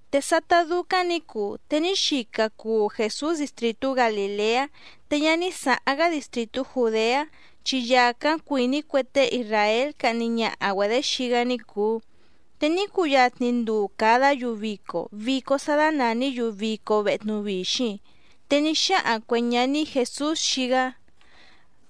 Te sátá dúcáⁿ nǐ cuu, te ní xica cuu Jèsús distrìtú Galìleá, te ñá ní sǎháⁿ‑gá distrìtú Jùdeá, chi yàcáⁿ cuìní cue tée isràél cahni ñaha‑güedě xii‑gá ní cùu. Te ní cuyatni nduu càdá‑yu vico, vico sá dánàní‑yu Vico Vehe Tnuvixiⁿ. Te ní xáhaⁿ cuè ñaní Jèsús xii‑gá: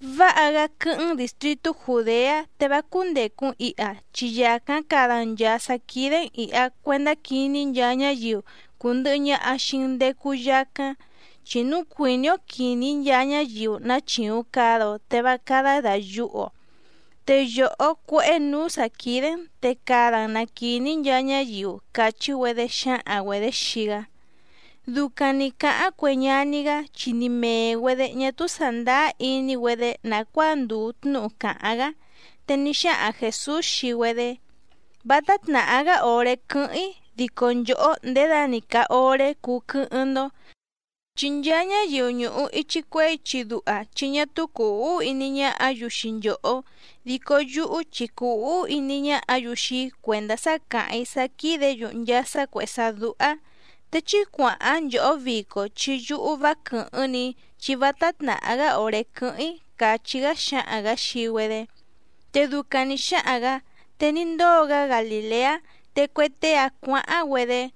—Váha‑gá quɨ́hɨ́ⁿ‑n dìstritú Jùdeá te vá cúndècu‑n iha, chi yàcáⁿ cada‑n nchàa sá quídé‑n ìha cuendá quiní nchaa ñáyiu cùndɨhɨ ñaha xii‑n ndecu yacáⁿ. Chi núu cuìní‑ó quìní nchaa ñáyiu ná chìuⁿ cada‑o te vá cádá dàyuhu‑o. Te yòhó cuéhé nǔú sǎ quídé‑n, te cada‑n na quìní nchaa ñáyiu —càchí‑güedé xǎhaⁿ‑güedě xii‑gá. Ducaⁿ nǐ cáháⁿ cue ñaní‑gá, chi ni mèe‑güedé ñá túú sàndáá iní‑güedé nàcuáa ndùu tnúhu càháⁿ‑gá. Te ní xáhaⁿ Jèsús xii‑güedé: —Vátá tnàhá‑gá òré quɨ́hɨ́ⁿ‑í dico nchòhó ndědani càa oré cuu quɨ́hɨ́ⁿ‑ndó. Chi nchaa ñáyiu ñùhu ichi cuehé ichi duha chi ñá túú cùu úhú iní ñáhǎ‑yu xii nchòhó. Dico yúhú chi cùu úhú iní ñáhǎ‑yu xii‑í cuèndá sá càháⁿ‑í sá quídě‑yu nchaa sá cuèhé sá dúhá. Te chí cuàháⁿ nchòhó vico chi yúhú vá quɨ̀hɨ́ⁿ‑ni‑í chi vátá tnàhá‑gá òré quɨ́hɨ́ⁿ‑í —càchí‑gá xáhaⁿ‑gǎ xii‑güedé. Te ducaⁿ nǐ xáhaⁿ‑gǎ te ní ndóo‑gá Galìleá, te cue tée‑áⁿ cuǎháⁿ‑güedé.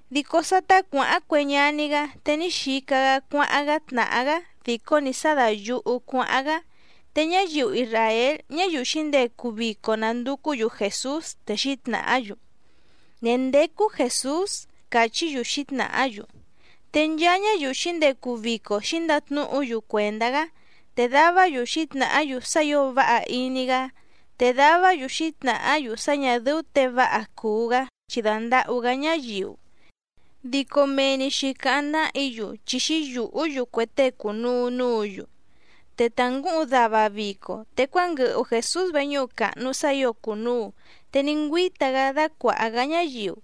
Dico sátá cuǎháⁿ cue ñaní‑gá, te ní xica‑gá cuáháⁿ‑gá tnàhá‑gá dìcó‑ni sá dàyuhu cuáháⁿ‑gá. Te ñáyiu isràél ñáyiu xǐndecu vico nànducú‑yu Jèsús, te xǐtnàhá‑yu: —¿Ndèé ndécú Jèsús? —càchí‑yu xǐtnàhá‑yu. Te nchaa ñáyiu xǐndecu vico xǐndatnúhu‑yu cuèndá‑gá. Te davá‑yu xǐtnàhá‑yu sá ǐo váha iní‑gá, te davá‑yu xǐtnàhá‑yu sá ñà dɨ́ú těe váha cùu‑gá, chi dàndahú‑gá ñáyiu. Dico mee‑ni xǐcáháⁿ náhǐ‑yu, chi xǐyùhú‑yu cue tée cùnuu núǔ‑yu. Te ta ngǔhuⁿ dava vico, te cuánguɨhu Jèsús veñúhu càhnu sá ǐo cùnuu, te ní ngüíta‑gá dácuàha‑gá ñáyiu.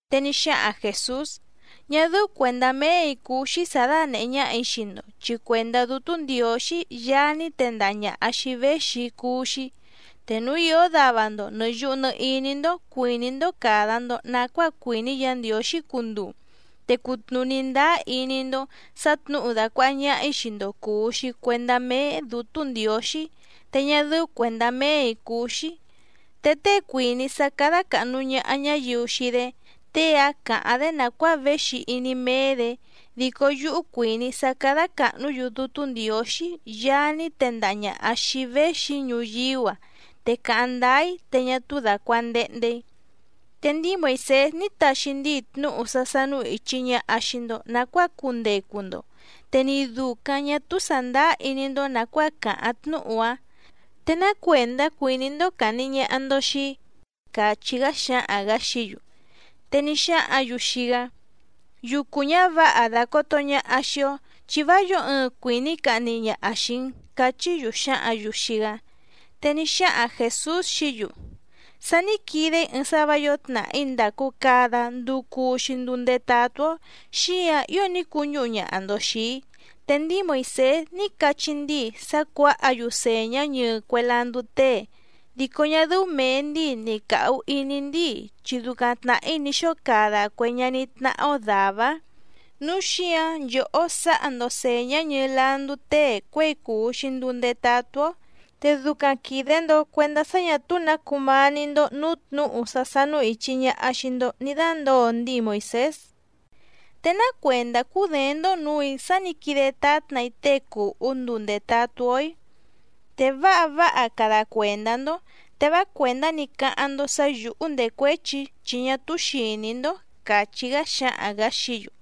Te ní xáhaⁿ Jèsús: —Ñá dɨ́ú cuèndá méè‑í cúú‑xí sǎ dánèhé ñáhà‑í xii‑ndo, chi cuèndá Dútú Ndiǒxí Yaá ní tendaha ñàha xii‑í véxi‑í cúú‑xí. Te núu ìó dava‑ndo nɨ̀ yuhu nɨ iní‑ndó cuìní‑ndó càda‑ndo nacuáa cuìní Yǎ Ndiǒxí cunduu, te cutnùní ndáá iní‑ndó sǎ tnǔhu dàcuaha ñaha‑í xii‑ndo cùu‑xi cuendá méé Dǔtú Ndiǒxí, te ñá dɨ́ú cuèndá méè‑í cúú‑xí. Te tée cuìní sá cádá càhnu ñaha ñáyiu xii‑dé, tée‑áⁿ càháⁿ‑dé nàcuáa véxi iní méé‑dě. Dico yúhú cuìní‑í sá cádá càhnú‑yu Dútú Ndiǒxí Yaá ní tendaha ñàha xii‑í véxi‑í ñuyíú‑a, te càháⁿ ndáá‑í te ñá túú dàcuandehnde‑í. ’Te ndíi Moìsés ní taxi ndíi tnúhu sá sánú ìchi ñaha xii‑ndo nacuáa cundecu‑ndo, te ni dùcaⁿ ñá túú sàndáá iní‑ndó nàcuáa càháⁿ tnúhu‑áⁿ. ¿Te ná cuèndá cuìní‑ndó càhni ñaha‑ndo xii‑í? —càchí‑gá xáhaⁿ‑gǎ xií‑yu. Te ní xáhǎⁿ‑yu xii‑gá: —Yucu ñǎvǎha dàcoto ñaha xii‑ó, chi vá yǒo ɨɨⁿ cuìní cahni ñaha xìi‑n —cachí‑yu xǎhǎⁿ‑yu xii‑gá. Te ní xáhaⁿ Jèsús xií‑yu: —Sá nǐ quide‑í ɨɨⁿ sá vǎ yǒo tnàhí ndàcu cada nduu cuu‑xi nduu ndetatú‑ó, xíǎⁿ ío ní cuñúhu ñaha‑ndo xìi‑í. Te ndíi Moìsés ní cachí ndíi sá cuǎha‑yu sèñá ñɨɨ cue landú tée, dico ñá dɨ́ú mèe ndíi ni càhu iní ndíi chi ducaⁿ tnàhí ní xóo cada cue ñaní tnáhá‑ó dàvá‑áⁿ, núu xíǎⁿ nchòhó sǎha‑ndo sèñá ñɨɨ landú tée cuěi cùu‑xi nduu ndetatú‑ó. Te ducaⁿ quìde‑ndo cuendá sá ñà túú nǎ cumání‑ndó nǔú tnǔhu sá sánú ìchi ñaha xii‑ndo ní dándǒo ndíi Moìsés. ¿Te ná cuèndá cúděéⁿ‑ndó nǔù‑í sá nǐ quide tátna‑í tée cùhú nduu ndètatú‑ó‑í? Te váha váha cada cuèndá‑ndó, te vá cuèndá‑ni cáháⁿ‑ndó sǎ yǔhú ndècuéchi‑í chi ñá túú xìní‑ndó —càchí‑gá xáhaⁿ‑gǎ xií‑yu.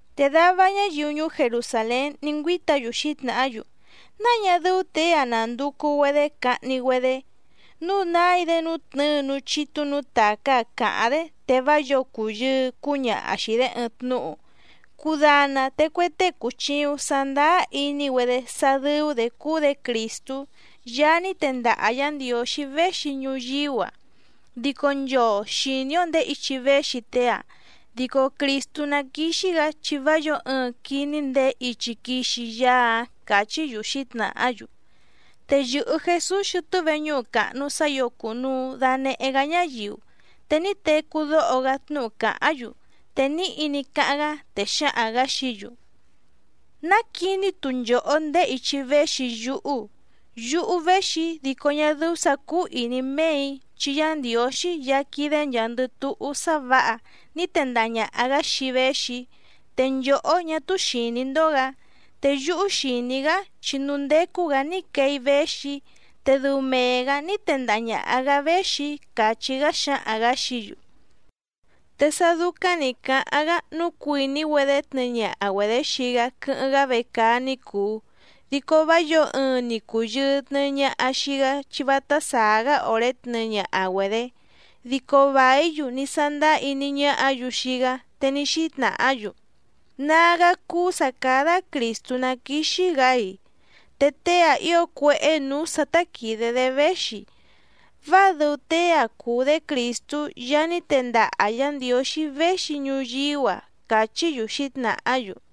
Te dava ñáyiu ñuú Jerusàlén ní ngüíta‑yu xǐtnàhá‑yu: —¿Náa ñá dɨ́ú těe‑áⁿ nándùcu‑güedé cahni‑güedé?, núu nái‑dé nútnɨ̌ɨ núú chítú nǔú tàcá‑ǎⁿ càháⁿ‑dé, te vá yǒo cùyɨɨ cúñaha xìi‑dé ɨɨⁿ tnúhu. Cudana te cue tée cùchiuⁿ sandáá iní‑güedé sá dɨ́ú‑dě cúú‑dě Crìstú Yaá ní tendaha Yǎ Ndiǒxí véxi ñuyíú‑a. Dico nchoo xìní‑ó ndèé ichi véxi tée‑ǎⁿ, dico Crìstú ná quìxi‑gá chi vá yǒo ɨɨⁿ quiní ndèé ichi quixi Yaá‑áⁿ —càchí‑yu xǐtnàhá‑yu. Te yɨ̀hɨ Jesús xɨtɨ́ veñúhu càhnu sá ǐo cùnuu danehe‑gá ñáyiu, te ní tecú dóho‑gá tnúhu càháⁿ‑yu. Te níhi ní cáháⁿ‑gá, te xáhaⁿ‑gǎ xií‑yu: —¡Ná quiní‑tu nchòhó ndèé ichi véxi yúhú! Yúhú véxi‑í dico ñá dɨ́ú sǎ cúú ìní méè‑í, chi Yá Ndiǒxí Yaá quídé nchàa‑ndɨ túhú sá vǎha ní tendaha ñàha‑gá xii‑í véxi‑í, te nchòhó ñá túú xìní‑ndó‑gǎ. Te yúhú xìní‑í‑gá chi núú ndécú‑gǎ ní quee‑í véxi‑í, te dɨu mee‑gǎ ní tendaha ñàha‑gá véxi‑í —càchí‑gá xáhaⁿ‑gǎ xií‑yu. Te sá dúcáⁿ nǐ cáháⁿ‑gá, núu cuìní‑güedé tnɨɨ ñaha‑güedě xii‑gá quɨ́hɨ́ⁿ‑gá vecaá ní cùu, dico vá yǒo ɨɨⁿ ni cùyɨɨ tnɨɨ ñaha xii‑gá chi vátá sàá‑gá òré tnɨɨ ñaha‑güedě. Dico vàí‑yu ní sándáá iní ñáhǎ‑yu xii‑gá, te ní xítnàhá‑yu: —¿Nágá cúú sǎ cádá Crìstú ná quìxi‑gá‑i?, te tée‑a ío cuéhé nǔú sǎ tá quìde‑dé véxi. Váa dɨu tée‑a cùu‑dé Crìstú Yaá ní tendaha Yá Ndiǒxí véxi ñuyíú‑a —càchí‑yu xǐtnàhá‑yu.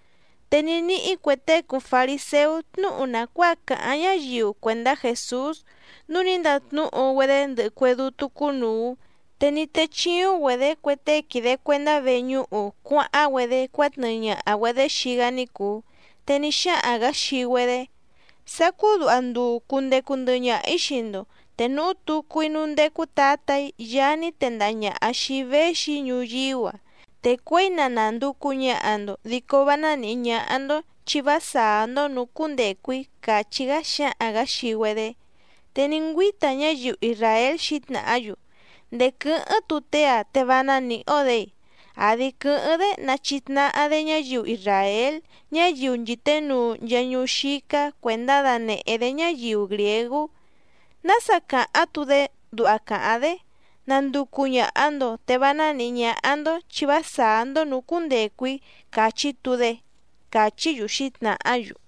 Te ní níhí cue tée cùu fariséú tnúhu nàcuáa càháⁿ ñáyiu cuèndá Jèsús, núu ní ndatnúhu‑güedé ndɨhɨ cue dútú cúnùu, te ní techìuⁿ‑güedé cue tée quìde cuendá veñúhu cuáháⁿ‑güedé cuátnɨɨ ñaha‑güedě xii‑gá ní cùu. Te ní xáhaⁿ‑gǎ xii‑güedé: —Sacú duha nduu cundecu ndɨhɨ ñaha‑ǐ xii‑ndo, te núhú tucu‑í núú ndécú tǎtà‑í Yaá ní tendaha ñàha xii‑í véxi‑í ñuyíú‑a. Te cuěi na nànducu ñaha‑ndo dico vá ná nìhí ñáhá‑ndó chi vá sàá‑ndó nǔú cúndècu‑í —càchí‑gá xáhaⁿ‑gǎ xii‑güedé. Te ní ngüíta ñáyiu isràél xǐtnàhá‑yu: —¿Ndèé quɨ́hɨ́ⁿ‑tu tée‑a te vá ná nìhí‑ó‑dě‑i? ¿Àdi quɨ́hɨ́ⁿ‑dé na chìtnahá‑dé ñáyiu isràél ñáyiu nchìténuu nchaa ñuú xícá cuèndá danèhé‑dé ñáyiu grìégú? ¿Nása càháⁿ‑tu‑dé duha càháⁿ‑dé: “Nanducu ñàha‑ndo te vá nánìhí ñáhá‑ndó chi vá sàá‑ndó nǔú cúndècu‑í”, càchí‑tu‑dé? —càchí‑yu xǐtnàhá‑yu.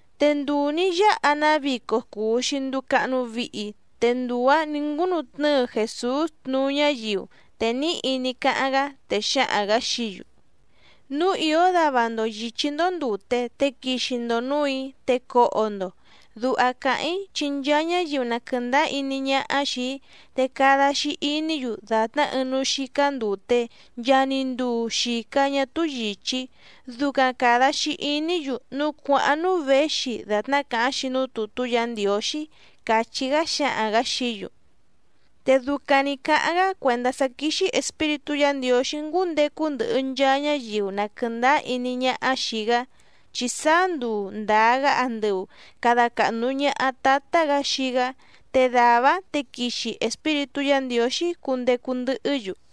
Te nduu nǐ yáha‑ná vico cùu‑xi nduu cahnu vihi, te nduu‑ǎⁿ nǐ ngúnu tnɨ́ɨ Jèsús tnuú ñáyiu, te níhi ní cáháⁿ‑gá, te xáhaⁿ‑gǎ xií‑yu: —Núu ìó dava‑ndo yìchí‑ndó ndùte, te quixi‑ndo nǔù‑í, te coho‑ndo. Duha càháⁿ‑í chi nchaa ñáyiu na quɨ̀ndáá iní ñáhá xìi‑í, te cada‑xi iní‑yu dàtná ɨɨⁿ núú xícá ndùte, nchaa‑ni nduu xìca ñá túú yìchí, ducaⁿ càda‑xi iní‑yu núú cuàháⁿ núú věxi dàtná càháⁿ‑xi núú tùtú Yǎ Ndiǒxí —càchí‑gá xáhaⁿ‑gǎ xií‑yu. Te ducaⁿ nǐ cáháⁿ‑gá cuèndá sá quíxí Espíritú Yǎ Ndiǒxí ngúndecu ndɨhɨ nchaa ñáyiu na quɨ̀ndáá iní ñáhá xìi‑gá, chi sáá nduu ndàa‑gá andɨu càda cahnu ñaha Tátá‑gǎ xii‑gá, te dàvá‑áⁿ te quixi Espíritú Yǎ Ndiǒxí cundecu ndɨhɨ́‑yu.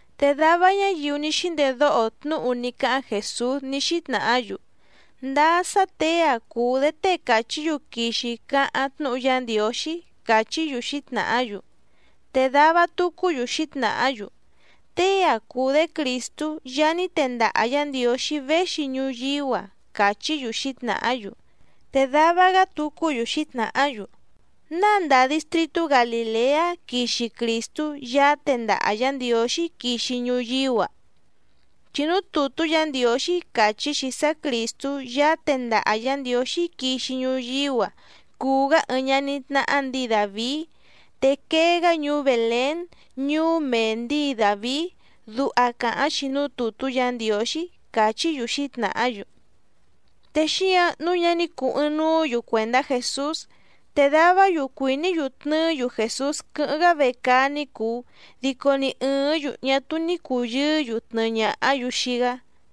Te dava ñáyiu ní xíndedóho tnúhu ní cáháⁿ Jèsús ní xítnàhá‑yu: —Ndáá sá těe‑a cùu‑dé tée càchí‑yu quixi cáháⁿ tnúhu Yá Ndiǒxí —càchí‑yu xǐtnàhá‑yu. Te dava tucú‑yu xǐtnàhá‑yu: —Tée‑a cùu‑dé Crìstú Yaá ní tendaha Yǎ Ndiǒxí véxi ñuyíú‑a —càchí‑yu xǐtnàhá‑yu. Te dava‑gá tucú‑yu xǐtnàhá‑yu: —¿Náa ndàa distritú Galìleá quixi Crìstú Yaá tendaha Yǎ Ndiǒxí quixi ñuyíú‑a? Chi núú tùtú Yǎ Ndiǒxí càchí‑xi sá Crìstú Yaá tendaha Yǎ Ndiǒxí quixi ñuyíú‑a cuu‑gá ɨɨⁿ ñaní tnáhá ndǐi Dàvií, te quee‑gá ñuú Bèlén ñuú méé ndǐi Dàvií, duha càháⁿ‑xi núú tùtú Yǎ Ndiǒxí —càchí‑yu xǐtnàhá‑yu. Te xíǎⁿ nǔu ñá ní cùu ɨɨⁿnuú‑yu cuèndá Jèsús. Te davá‑yu cuìní‑yu tnɨɨ́‑yu Jèsús quɨ́hɨ́ⁿ‑gá vecaá ní cùu, dico ni ɨ̀ɨ́ⁿ‑yu ñá túú ní cùyɨɨ́‑yu tnɨɨ ñàhá‑yu xii‑gá.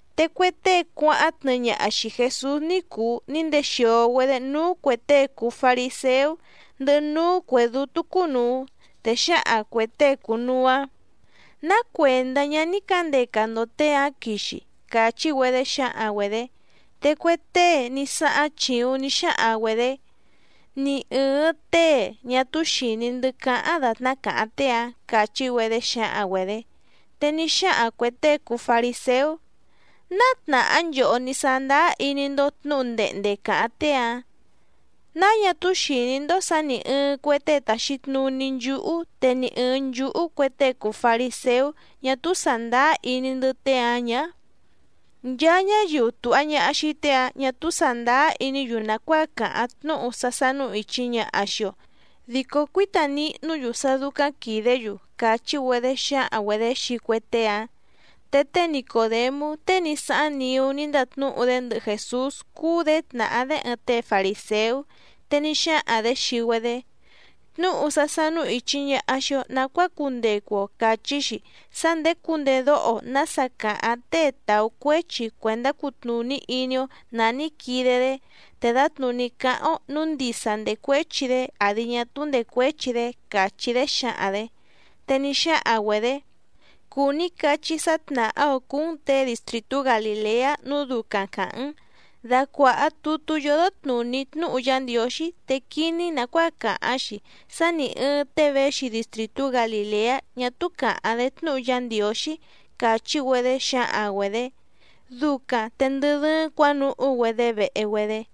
Te cue tée cuáháⁿ tnɨɨ ñaha xìi Jesús ní cùu ní ndexìo‑güedé núú cuè tée cùu fariséú ndɨhɨ núú cuè dútú cúnùu. Te xǎhaⁿ cuè tée cùnuu‑áⁿ: —¿Ná cuèndá ñá ní cǎndeca‑ndo těe‑ǎⁿ quixi? —càchí‑güedé xǎhaⁿ‑güedě. Te cue tée ní sáháⁿ chìuⁿ ní xáhaⁿ‑güedě: —Ni ɨ̀ɨⁿ tée ñá túú xìní‑ndɨ́ cáháⁿ dàtná càháⁿ tée‑ǎⁿ —càchí‑güedé xǎhaⁿ‑güedě. Te ní xáhaⁿ cuè tée cùu fariséú: —¿Náa tnàhá nchòhó ní sándáá iní‑ndó tnǔhu ndehnde càháⁿ tée‑ǎⁿ? ¿Náa ñá túú xìní‑ndó sǎ nì ɨɨⁿ cue tée tàxi tnuní nchúhú, te ni ɨ̀ɨⁿ nchúhú cue tée cùu fariséú ñá túú sàndáá iní‑ndɨ́ tée‑ǎⁿ ñǎ? Nchaa ñáyiu tùha ñaha xii tée‑ǎⁿ ñá túú sàndáá iní‑yu nàcuáa càháⁿ tnúhu sá sánú ìchi ñaha xii‑o, dico cuíta nihnú‑yu sá dúcáⁿ quìdé‑yu —càchí‑güedé xǎhaⁿ‑güedě xii cue tée‑áⁿ. Te té Nicòdemú tée ní sáháⁿ niú ní ndatnúhu‑dé ndɨhɨ Jèsús cúú‑dě tnàhá‑dé ɨɨⁿ tée farìséú, te ní xáhaⁿ‑dě xii‑güedé: —Tnúhu sá sánú ìchi ñaha xii‑o nacuáa cundecu‑o càchí‑xi sá ndèé cundedóho‑o nǎsa càháⁿ tée tàú cuéchi cuèndá cutnùní iní‑ó nǎ ní quide‑dé, te dǎtnùní cáháⁿ‑ó nǔu ndisa ndècuéchi‑dé àdi ñá túú ndècuéchi‑dé —càchí‑dé xǎhaⁿ‑dě. Te ní xáhaⁿ‑güedě: —Cùu ní cachí sá tnàhá‑ǒ cúú‑n těe distrìtú Galìleá nǔu ducaⁿ càháⁿ‑n. Dacuàha tutú yódó tnùní tnúhu Yá Ndiǒxí te quiní‑n nàcuáa càháⁿ‑xi sá nì ɨɨⁿ tée véxi distrìtú Galìleá ñá túú càháⁿ‑dé tnúhu Yá Ndiǒxí —càchí‑güedé xǎhaⁿ‑güedě. Ducaⁿ te ndɨ dɨ́ɨ́ⁿ cuǎnuhú‑güedé vehe‑güedé.